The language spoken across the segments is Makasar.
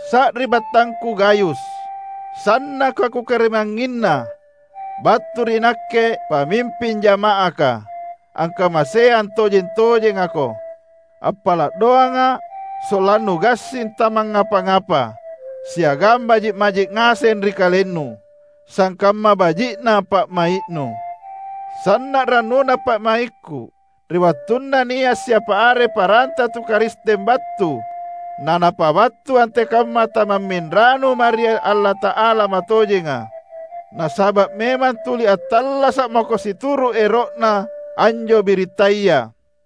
Sari’battangku Gayus, sannaka kukarimangnginna! Battu ri nakke, pamimping jama’aka, angkamaseang tojeng-tojengako; appala’ doanga’ sollannu gassing tamangngapa-apa, siagang baji’-baji’ ngaseng ri kalennu, sangkamma baji’na pa’mai’nu. Sanna’ rannuna pa’maikku ri wattunna nia’ siapa are paranta tu Karisteng battu na napabattu antekamma tamamminranu mae ri Allata’ala matojenga; nasaba’ memang tuli attallasa’ mako situru’ ero’na anjo birittaya.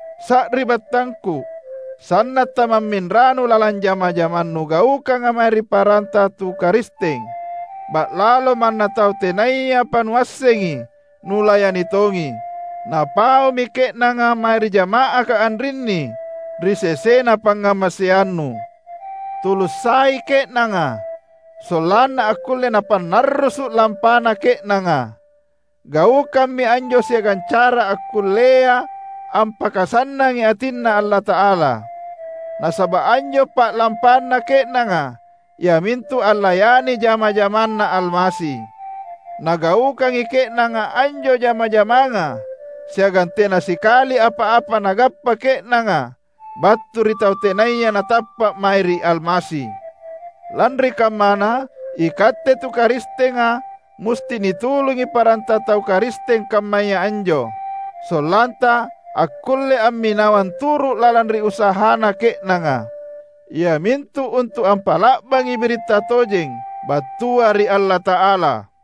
Sari’battangku! Sanna’ tamamminranu lalang jama-jamang nugaukanga mae ri paranta tu Karisteng; ba’lalo manna tau tenayapa nuassengi, nulayani tongi. Napaumi ke’nanga mae ri jama’aka anrinni ri sesena pangngamaseannu. Tulung sai ke’nanga sollanna akkulle napannarrusu’ lampana ke’nanga. Gaukammi anjo siagang cara akkullea ampakasannangi atinNa Allata’ala, nasaba’ anjo pa’lampanna ke’nanga iamintu allayani jama-jamanNa Almasi. Nagaukangi ke’nanga anjo jama-jamanga siagang tena sikali apa-apa nagappa ke’nanga battu ri tau tenaya natappa’ mae ri Almasi. Lanri kammana, ikatte tu Karistenga musti nitulungi paranta tu Karisteng kammaya anjo, sollanta akkulle amminawang turu’ lalang ri usahana ke’nanga, iamintu untu’ ampa’la’bangi biritta tojeng battua ri Allata’ala.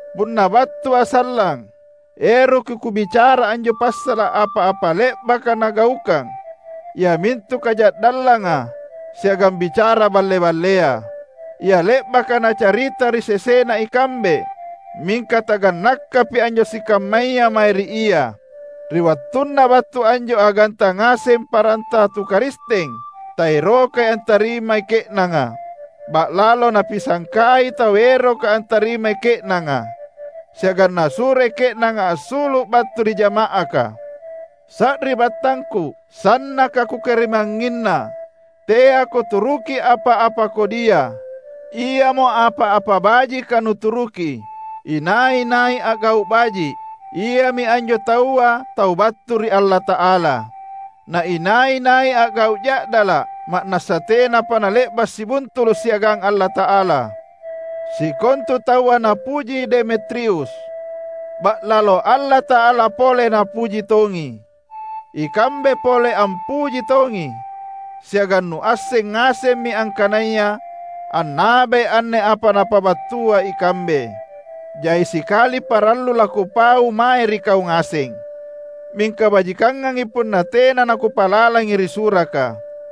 Punna battua’ sallang, eroki kubicara anjo passala’ apa-apa le’baka nagaukang iamintu kaja’dallanga siagang bicara balle-ballea, ia le’baka nacarita ri sesena ikambe! Mingka tagannakapi anjo sikammaya mae ri ia. Ri wattunna battu anjo aganta ngaseng paranta tu Karisteng, taerokai antarimai ke’nanga. Ba’lalo napisangkai tau eroka antarimai ke’nanga, siagang nasuroi ke’nanga assulu’ battu ri jama’aka! Sari’battangku, sannaka kukarimangnginna; teako turuki apa-apa kodia. Iamo apa-apa bajika nuturuki. Inai-nai a’gau’ baji’, iami anjo taua tau battu ri Allata’ala. Na inai-nai a’gau’ ja’dala’, ma’nassa tenapa nale’ba’ sibuntulu’ siagang Allata’ala. Sikontu taua napuji Demetrius. Ba’lalo Allata’ala pole Napuji tongi. Ikambe pole ampuji tongi, siagang nuasseng ngasemmi angkanaya annabai anne apa napabattua ikambe. Jai sikali parallu lakupau mae ri kau ngaseng, mingka bajikangangi punna tena nakupalalangi ri suraka.